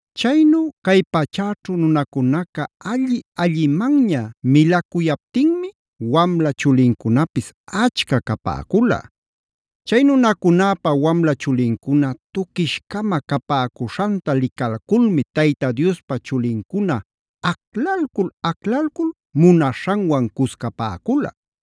Chaynu cay pachäćhu nunacunaca alli-allimanña milacuyaptinmi wamla chulincunapis achca capäcula. Chay nunacunäpa wamla chulincuna tuquish-cama capäcuśhanta licalculmi Tayta Diospa chulincuna aclalcul-aclalcul munaśhanwan cuscapäcula.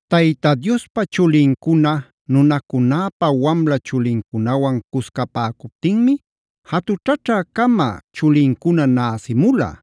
Tayta Diospa chulincuna nunacunäpa wamla chulincunawan cuscapäcuptinmi jatućhaćhä-cama chulincuna näsïmula.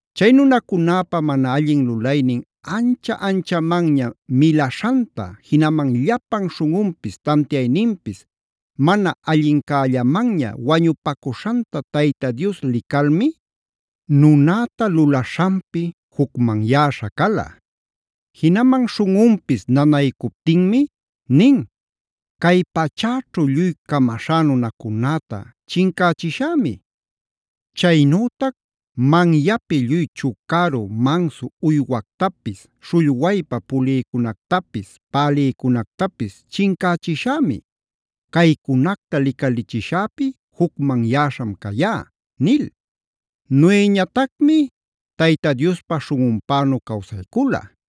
Chay nunacunäpa mana allin lulaynin ancha-anchamanña milaśhanta, jinaman llapan śhunꞌunpis tantiayninpis mana allincällamanña wañupacuśhanta Tayta Dios licalmi, nunäta lulaśhanpi jucmanyäśha cala. Jinaman śhunꞌunpis nanaycuptinmi nin: “Cay pachäćhu lluy camaśhá nunacunäta chincächishämi; chaynütac manyapi lluy chucaru mansu uywactapis, śhullwaypa pulïcunactapis, pälïcunactapis chincächishämi. ¡Caycunacta licalichishäpi jucmanyäśham cayá!” nil. Noeñatacmi Tayta Diospa śhunꞌunpänu cawsaycula.b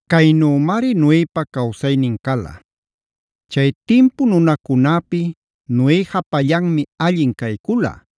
Caynümari Noepa cawsaynin cala: Chay timpu nunacunäpi Noe japallanmi allin caycula;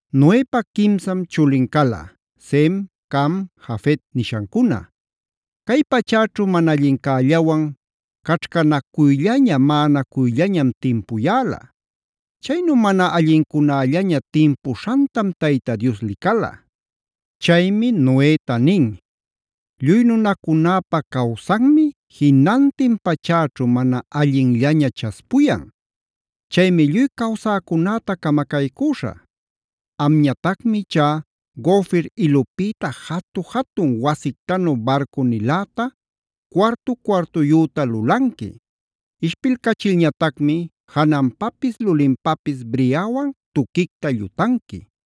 Noepa quimsam chulin cala: Sem, Cam, Jafet nishancuna. Cay pachäćhu mana allincällawan caćhcanacuyllaña, maꞌanacuyllañam timpuyäla. Chaynu mana allincunällaña timpuśhantam Tayta Dios licala. Chaymi Noeta nin: “Lluy nunacunäpa-cawsanmi jinantin pachäćhu mana allinllaña chaspuyan. Chaymi lluy cawsäcunäta camacaycüśhä. Amñatacmi ichá gofer ilupïta jatu-jatun wasictanu barcu-niläta cuartu-cuartuyüta lulanqui. Ishpilcachilñatacmi jananpapis lulinpapis briawan tuquicta llutanqui.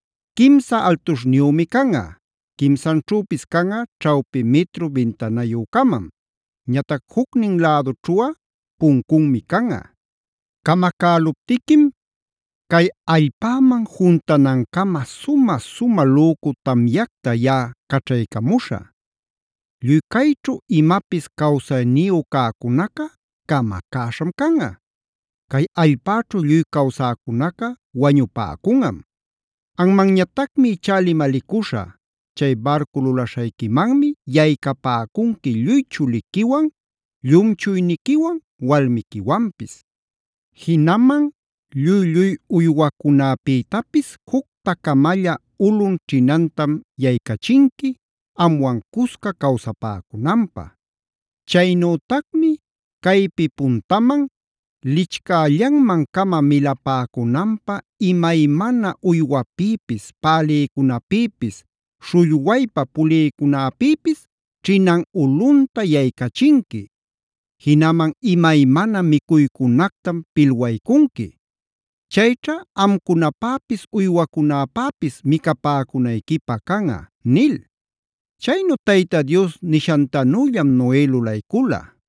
Quimsa altuśhniyümi canꞌa. Quimsanćhüpis canꞌa ćhawpi mitru bintanayü-camam. Ñatac jucnin lädućhuꞌa puncunmi canꞌa. Camacäluptiquim cay allpäman juntanancama sumä-sumä lücu tamyacta yaꞌa caćhaycamuśhä. Lluy cayćhu imapis cawsayniyu cäcunaca camacäśham canꞌa. Cay allpäćhu lluy cawsäcunaca wañupäcunꞌam. Anmanñatacmi ichá limalicuśhä: ‘Chay barcu lulaśhayquimanmi yaycapäcunqui lluy chuliquiwan, llumchuyniquiwan, walmiquiwanpis. Jinaman lluy-lluy uywacunäpïtapis jucta-camalla ulun ćhinantam yaycachinqui, amwan cusca cawsapäcunanpä’. Chaynütacmi caypi puntaman lichcällanman-cama milapäcunanpä imaymana uywapïpis, pälïcunäpïpis, śhullwaypa pulïcunäpïpis ćhinan ulunta yaycachinqui. Jinaman imaymana micuycunactam pilwaycunqui. Chayćha amcunapäpis uywacunäpäpis micapäcunayquipä canꞌa” nil. Chaynu Tayta Dios nishantanüllam Noe lulaycula.d